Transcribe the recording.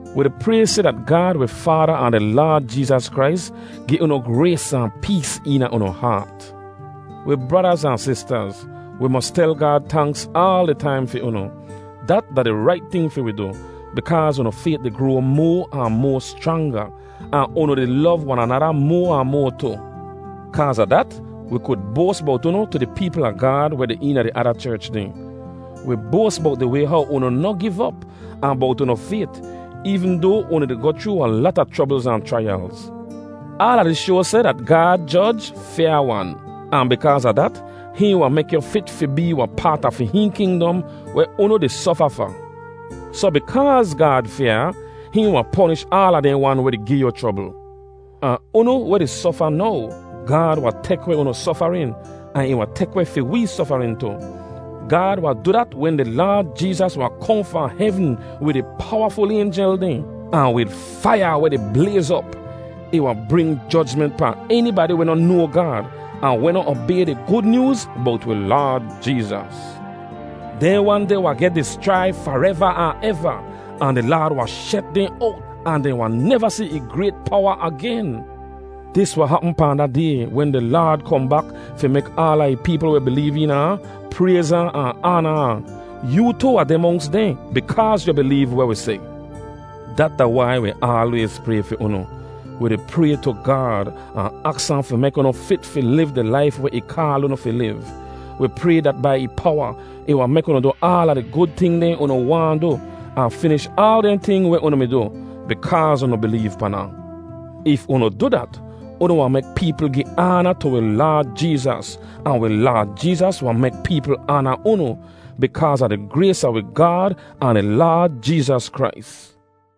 Wi di pray seh dat Gaad wi Faada ahn di Laad Jeezas Krais gi unu grays ahn pees eena unu haat. Wi bradaz ahn sistaz, wi mos tel Gaad tanks aal di taim fi unu. Dat da di rait ting fi wi du, bikaaz unu fayt di groa moa ahn moa schranga, ahn unu di lov wan anada moa ahn moa tu. Kaaz a dat, wi kud boas bowt unu tu di peepl a Gaad weh deh eena di ada cherch dehn. Wi boas bowt di way how unu noh giv op ahn bowt unu fayt eevn doa unu di goh chroo wahn lata chroblz ahn chraiyalz. Aala dis shoa seh dat Gaad joj fyaa-wan, ahn bikaaz a dat, hihn wahn mek yu fit fi bee wahn paat a fi hihn kingdom weh unu di sofa fa. Soh bikaaz Gaad fyaa, hihn wahn ponish aala dehn wan weh di gi yu chrobl. Ahn unu weh di sofa now, Gaad wahn tek weh unu sofarin, ahn ih wahn tek weh fi wee sofarin tu. Gaad wahn du dat wen di Laad Jeezas wahn kohn fahn hevn wid ih powaful aynjel dehn, ahn wid faiya weh di blayz op. Ih wahn bring jojment pahn enibadi weh noh noa Gaad ahn weh noh obay di Gud Nyooz bowt wi Laad Jeezas. Dehn wan deh wahn geh dischrai fareva ahn eva, ahn di Laad wahn shet dehn owt ahn dehn wahn neva si ih grayt powa agen. Dis wahn hapm pahn da Day wen di Laad kohn bak fi mek aala ih peepl weh bileev eena ahn, prayz ahn an aana ahn. Yoo tu wahn deh monks dehn, bikaaz yu bileev weh wi seh. Dat da wai wi aalwayz pray fi unu. Wi di pray tu Gaad, ahn aks ahn fi mek unu fit fi liv di laif weh ih kaal unu fi liv. Wi pray dat bai ih powa, ih wahn mek unu du aala di gud ting dehn unu waahn du, ahn finish aal dehn ting weh unu mi du, bikaaz unu bileev pan ahn. If unu du dat, unu wahn mek peepl gi aana tu wi Laad Jeezas, ahn wi Laad Jeezas wahn mek peepl aana unu, bikaaz a di grays a wi Gaad ahn di Laad Jeezas Krais.